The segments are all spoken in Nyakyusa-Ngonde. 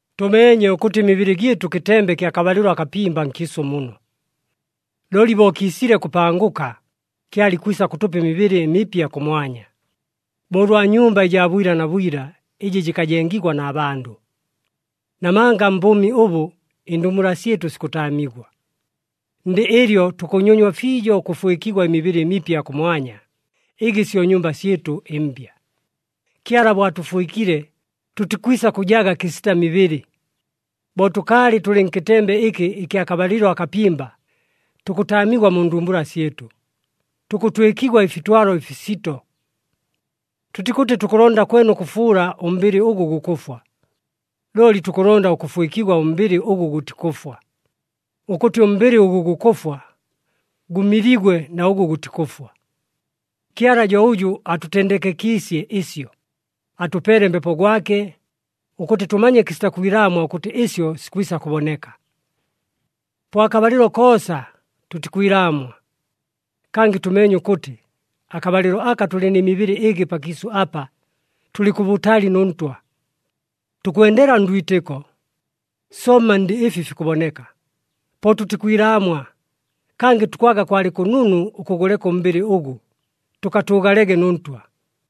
Tʉmeenye ʉkʉtɨ ɨmibɨlɨ gyɨtʉ kɨtembe kya kabalɨlo akapimba nkiisʉ muno. Looli bo kiisile kʉpangʉka, Kyala ikwisa kʉtʉpa ɨmibɨlɨ ɨmipya kʉmwanya, bo ʉlwa nyumba ɨjaa bwila na bwila, ɨjɨ jɨkajengigwa na bandʉ. Namanga mbʉʉmi ʉbʉ, ɨndumbula syɨtʉ sikʉtaamigwa. Ndɨ ɨlyo tukʉnyonywa fiijo ʉkʉfwɨkigwa ɨmibɨlɨ ɨmipya kʉmwanya, ɨgɨ syo nyumba syɨtʉ ɨmbya. Kyala bo atʉfwɨkile, tʉtikwisa kʉjaga kɨsita mibɨlɨ. Bo tʉkaalɨ tʉlɨ nkɨtembe ɨkɨ ɨkya kabalɨlo akapimba, tukʉtaamigwa mu ndumbula syɨtʉ, tukʉtwɨkigwa ɨfitwalo ɨfisito. Tʉtikʉtɨ tukʉlonda kwene ʉkʉfuula ʉmbɨlɨ ʉgʉ gukʉfwa, looli tukʉlonda ʉkʉfwɨkigwa ʉmbɨlɨ ʉgʉ gʉtikʉfwa, ʉkʉtɨ ʉmbɨlɨ ʉgʉ gukʉfwa gʉmiligwe na ʉgʉ gʉtikʉfwa. Kyala jo ʉjʉ atʉtendekekiisye ɨsyo, atʉpeele Mbepo gwake, ʉkʉtɨ tʉmanye kɨsita kwilaamwa ʉkʉtɨ ɨsyo sikwisa kʉboneka. Po akabalɨlo koosa, tʉtikwilaamwa. Kangɨ tʉmeenye ʉkʉtɨ, akabalɨlo aka tʉlɨ nɨ mibɨlɨ ɨgɨ pakiisʉ apa, tʉlɨ kʉbʉtali nʉ Ntwa. Tukwendela ndwitɨko, somma ndɨ ɨfi fikʉboneka. Po tʉtikwilaamwa, kangɨ tukwaga kwalɨ kʉnunu ʉkʉgʉleka ʉmbɨlɨ ʉgʉ, tʉkatʉʉgalege nʉ Ntwa.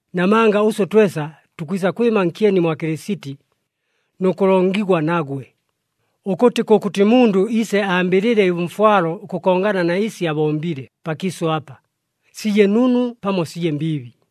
Namanga ʉswe twesa tukwisa kwɨma nkyeni mwa Kɨlɨsiti, nʉ kʉlongigwa nagwe, ʉkʉtɨ kʉkʉtɨ mundʉ iise ambɨlɨle ʉmfwalo ʉkʉkongana na ɨsi abombile pakiisʉ apa, sije nunu pamo sije mbiibi.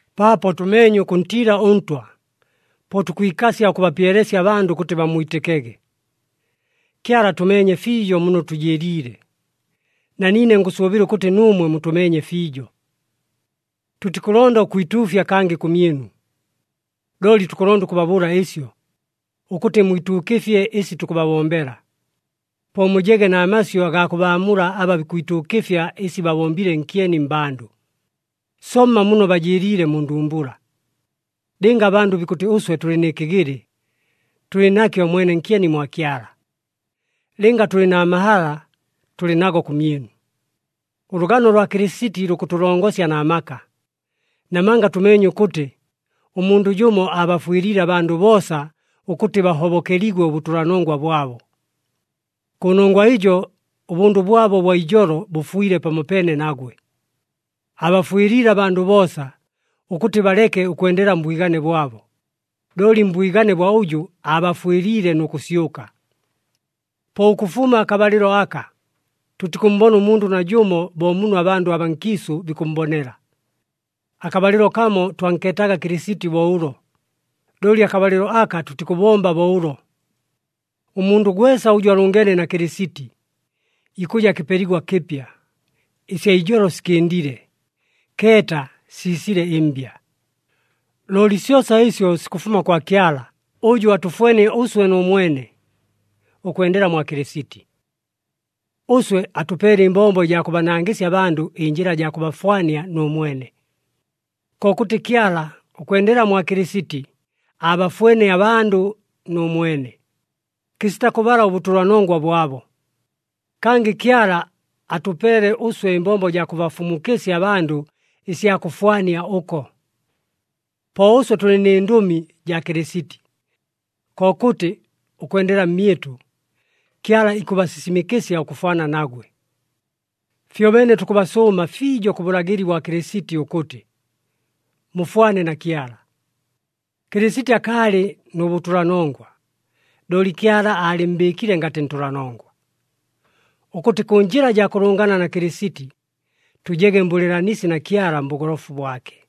Paapo tʉmeenye ʉkʉntiila ʉNtwa, po tukwikasya ʉkʉbapyelesya abandʉ ʉkʉtɨ bammwitɨkege. Kyala atʉmeenye fiijo muno tʉjɨɨliile, na niine ngʉsʉʉbɨla ʉkʉtɨ nuumwe mutʉmeenye fiijo. Tʉtikʉlonda ʉkwituufya kangɨ kʉmyɨnu, looli tukʉlonda ʉkʉbabʉʉla ɨsyo, ʉkʉtɨ mwituukɨfye ɨsi tukʉbabombela. Po mujege na masyʉ agaa kʉbaamula aba bikwituukɨfya ɨsi babombile nkyeni mmbandʉ, somma muno bajɨɨliile mu ndumbula. Lɨnga abandʉ bikʉtɨ ʉswe tʉlɨ nɨ kɨgɨlɨ, tʉlɨ nakyo mwene nkyeni mwa Kyala. Lɨnga tʉlɨ na mahala, tʉlɨ nago kʉmyɨnu. Ʉlʉgano lwa Kɨlɨsiti lukʉtʉlongosya na maka, namanga tʉmeenye ʉkʉtɨ, ʉmundʉ jʉmo aabafwɨliile abandʉ boosa ʉkʉtɨ bahobokeligwe ʉbʉtʉlanongwa bwabo. Kʉnongwa ɨjo ʉbʉndʉ bwabo ʉbwa ijolo bʉfwile pamopeene nagwe. Aabafwɨliile abandʉ boosa, ʉkʉtɨ baleke ʉkwendela mbwigane bwabo, looli mbwigane bwa ʉjʉ aabafwɨliile nʉ kʉsyʉka. Po ʉkʉfuma akabalɨlo aka, tʉtikʉmmbona ʉmundʉ najʉmo bo muno abandʉ abaa nkiisʉ bikʉmmbonela. Akabalɨlo kamo twankeetaga Kɨlɨsiti bo ʉlo, looli akabalɨlo aka tʉtikʉbomba bo ʉlo. Ʉmundʉ gwesa ʉjʉ alʉngeene na Kɨlɨsiti, ikʉja kɨpeligwa kɨpya. Ɨsya ijolo sikɨndile. Keeta, siisile ɨmbya! Looli syosa ɨsyo sikʉfuma kwa Kyala, ʉjʉ atʉfwenie ʉswe nʉ mwene, ʉkwendela mwa Kɨlɨsiti. Ʉswe atʉpeele ɨmbombo ɨjaa kʉbanangɨsya abandʉ ɨnjɨla jaa kʉbafwania nʉ mwene. Kokʉtɨ Kyala, ʉkwendela mwa Kɨlɨsiti, aabafwenie abandʉ nʉ mwene, kɨsita kʉbala ʉbʉtʉlanongwa bwabo. Kangɨ Kyala atʉpeele ʉswe ɨmbombo jaa kʉbafumukɨsya abandʉ ɨsya kʉfwania ʉko. Po ʉswe tʉlɨ nɨ Ndʉmi jaa Kɨlɨsiti. Kokʉtɨ, ʉkwendela mmyɨtʉ, Kyala ikʉbasisimɨkɨsya ʉkʉfwana nagwe. Fyobeene tukʉbasʉʉma fiijo kʉ bʉlagɨli bwa Kɨlɨsiti ʉkʉtɨ, mufwane na Kyala. Kɨlɨsiti akaalɨ nʉ bʉtʉlanongwa, looli Kyala aalɨmmbɨɨkile ngatɨ ntʉlanongwa, ʉkʉtɨ kʉ njɨla jaa kʉlʉngana na Kɨlɨsiti, tʉjege mbʉlɨɨlanisi na Kyala mbʉgolofu bwake.